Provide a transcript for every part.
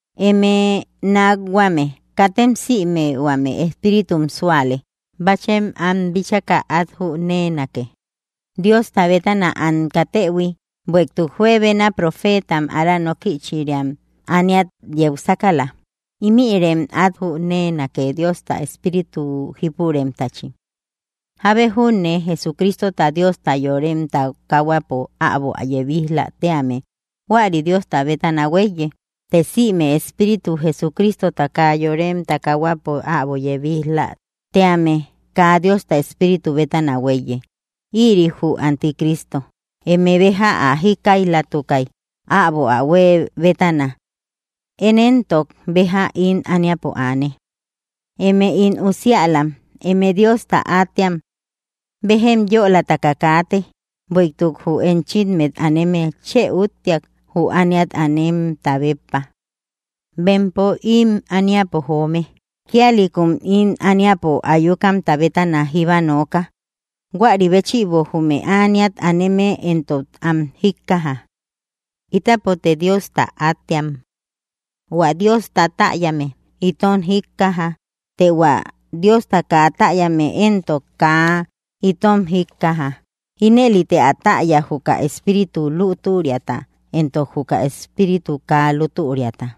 Eme nákhuame, katem sïme huame espíritum súale. Báchem am bitchaka at jüneenake, Diosta bétana am katëhui, bueïtuk juebena profeetam ára nókïchiram ániat yeu sákala. Ímïrem át jüneenake Diosta Espíritu jípuremtachi: Jábe júne Jesucristota, Diosta, yorem takahuapo äbo ä yebij‑la tíame, huäri Diosta bétana huéiye. Të sïme espíritu Jesucristota, kaa yorem takahuapo äbo ä yebij‑la tíame kaa Diosta Espíritu bétana huéiye, ïri jü anti Cristo. Eme béja ä jíkkaijlatukay, äbo ä huë bétana. Én éntok, béja ím ániapo aane. Eme ín usiälam, eme Diosta átteam. Béjem yölataka káate, bueïtuk jü enchimmet aneme chë úttiak jü ániat ánemta béppa. Bempo ím ániapo joome; kíalïkum ím ániapo ayukamta bétana jíba nooka; huäri béchïbo jume ániat aneme entok am jíkkaja. Ítapote Diosta átteam. Huä Diosta täyame itom jíkkaja. Të hua Diosta kaa täyame éntok, kaa itom jíkkaja. Inëlite ä täya juka espíritu lútüriata, éntok juka espíritu kaa lútüriata.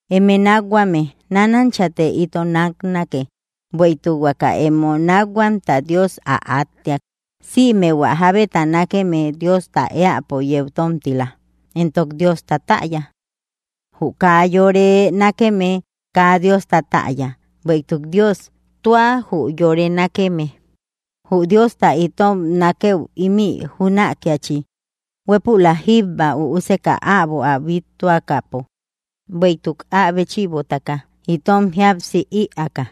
Eme nákhuame, nánanchate ito náknake, bueïtuk huaka emo nákhuamta Dios ä átteak. Sïme hua jábeta nákeme Diosta eäpo yeu tomtila, éntok Diosta täya. Jü kaa yore nákeme, kaa Diosta täya, bueïtuk Dios, tua jü yore nákeme. Jü Diosta itom nákëu ímï jünakiachi, huépülak jíba Üuseka äbo ä bíttuakäpo, bueïtuk ä béchïbotaka itom jíapsi iäka.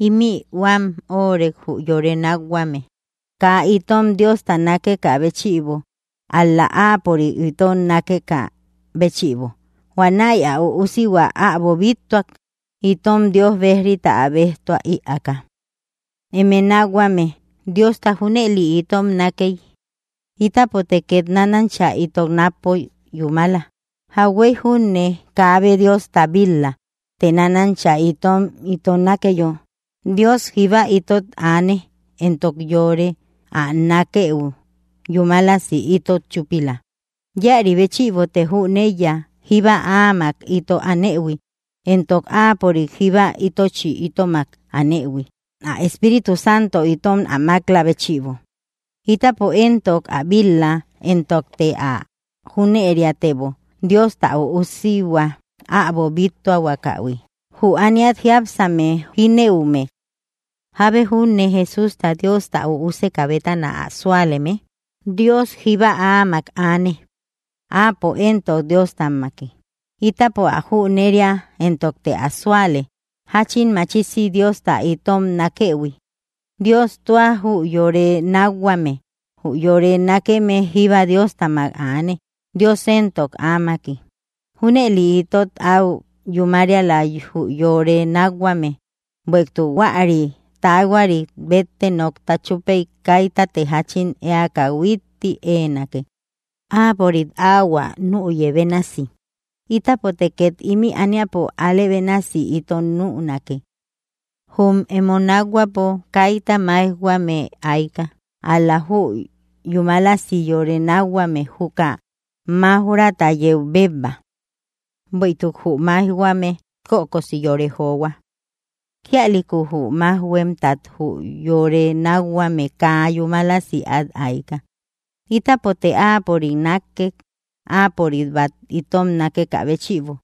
Ímï huam örek jü yore nákhuame: kaa itom Diosta nakekä bëchïbo, ál‑la Ápörik itom nákekä béchïbo, huanäi ä Üusihua äbo bíttuak, itom Dios bejrita ä béjtua ïaaka. Eme nákhuame, Diosta junëli itom nákey, ítapote ket nanancha ito nakpo yúmala. Jauhuey júne kaabe Diosta bíl‑la. Të nánancha itom ito nákeyo, Dios jíba itot aane, éntok yore ä nákëu yumälasi itot chúpila. Íäri béchïbote jüneiya jíba áamak ito anëhui, éntok áapörik jíba itochi itomak anëhui, ä Espíritu Santo itom ä mak‑lä béchïbo. Ítapo éntok, ä bíl‑la, éntokte ä jüneriatebo, Diosta ä Üusihua äbo bíttuakähui, jü ániat jiápsame jínëume. Jábe junne Jesústa Diosta ä Üusekä bétana ä súaleme, Dios jíba áamak aane, áapo éntok, Dióstamaki. Ítapo ä jüneria, éntokte ä súale, jáchin machisi Diosta itom nákëhui. Dios, tua jü yore nákhuame. Jü yore nákeme jíba Diostamak aane, Dios éntok, áamaki. Júnëli itot au yúmariala jü yore nákhuame, bueïtuk huäri taahuari bette nokta chupey kaitatte jachin eaka huitti eenake, Áapörik ahuä nüye bénasi, ítapote ket ímï ániapo álë bénasi ito nünake. Jum emo nákhuäpo kaita máijhuame aika, ál‑la jü yúmalasi yore nákhuame juka máuj‑rata yeu bebba. Bueïtuk jü maijhuame kökosi yore johua. Kíalïku jü májhuemtat jü yore nákhuame kaa yúmalasi at aika. Ítapote Áapörik nákke, áapörik bat itom nákekä béchïbo.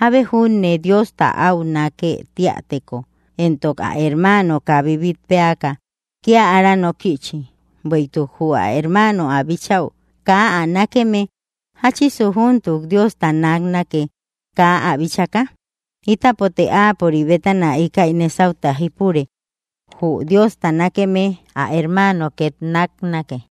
Jábe júne Diosta au nákë tíäteko, entok ä hermaano kaa bibitpéaka, kía ára nókïchi. Bueïtuk jü ä hermaano ä bíchau kaa ä nákeme, ¿jáchisu júntuk Diosta náknake, kaa ä bíchaka? Ítapote Áapörik bétana íkäi nésauta jípure. Jü Diosta nákeme, ä hermaano két náknake.